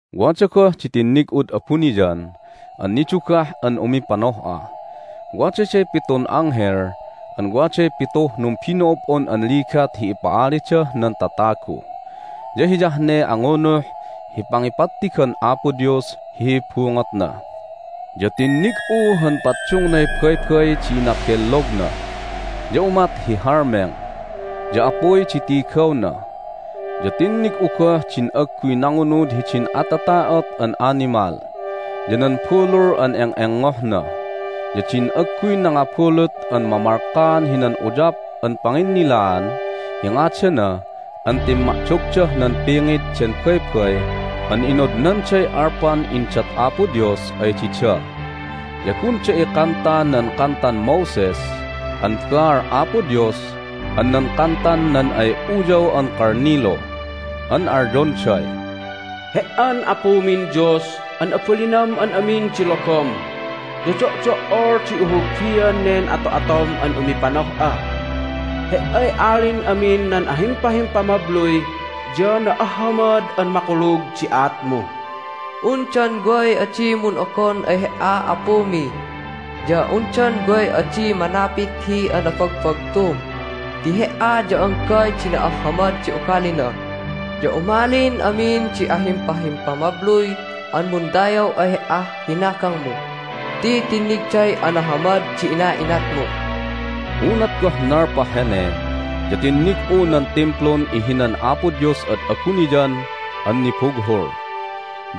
Wada goh di tinnig'ud abuniyan an nidugah an umipanoh'a. Wadaday pitun anghel an waday pituh numbino'ob'on an ligat hi ipa'alidah nan tatagu. Ya hiyah ne angunuh hi pangipattigan Apo Dios hi bungotna. Ya tinnig'u han paddungnay baybay di inabellogna, ya umat hi halmeng, ya apuy di tigawna. Ya tinnig'u goh din agguy nangunud hidin atata'ot an animal, ya nan bulul an eng'engohna, ya din agguy nangabulut an mamalkaan hinan uyap an panginnilaan hi ngadana an timma'dogdah nan pingit den baybay an inodnanday alpan indat Apo Dios ay dida. Ya gunda ikanta nan kantan Moses an baal Apo Dios an nan kantan nan ay Uyaw an Kalnilu. An alyonday, "He"an Apumin Dios an abalinam an amin di logom, ya do'do"ol di ihulbian nen ato'atom an umipanoh'a! He"ay Alin amin nan ahimpahimpamabluy, ya na'ahhamad an makulug di aatmu! Undan way adi mun'ogon ay He"a, Apumi? Ya undan way adi manapit hi anabagbagtum? Ti He"a ya anggay di na'ahhamad di ugalina, ya umalin amin di ahimpahimpamabluy an mundayaw ay He"ah hinagangmu ti tinnigday ana'ahhamad di ina'inatmu." Unat goh nalpah hene ya tinnig'u nan Timplun ihinan Apo Dios ad abuniyan an nibughul,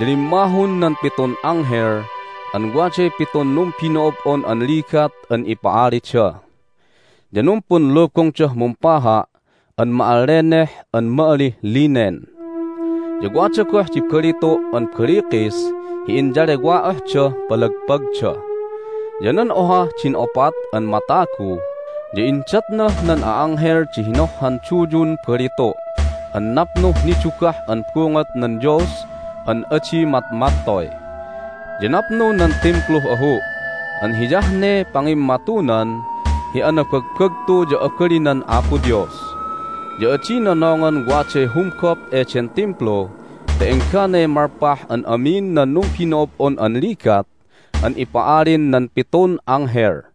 ya limmahun nan pitun anghel an waday pitun numbino'ob'on an ligat an ipa'alida. Ya numpunlubungdah mumpaha' an ma'alleneh an ma'alih linen, ya wada goh di balitu' an balikis hi inyalewa'ohdah palagpagda. Ya nan ohah din opat an matagu ya indatnah nan a'anghel di hinohhan duyun balitu' an napnuh nidugah an bungot nan Dios an adi matmattoy. Ya napnu nan Timpluh ahu' an hiyah ne pangimmatunan hi anabagbagtu ya abalinan Apo Dios. Ya adi nonongan waday humgop eden Timplu ta engganay malpah an amin nan numbino'ob'on an ligat an ipa'alin nan pitun anghel.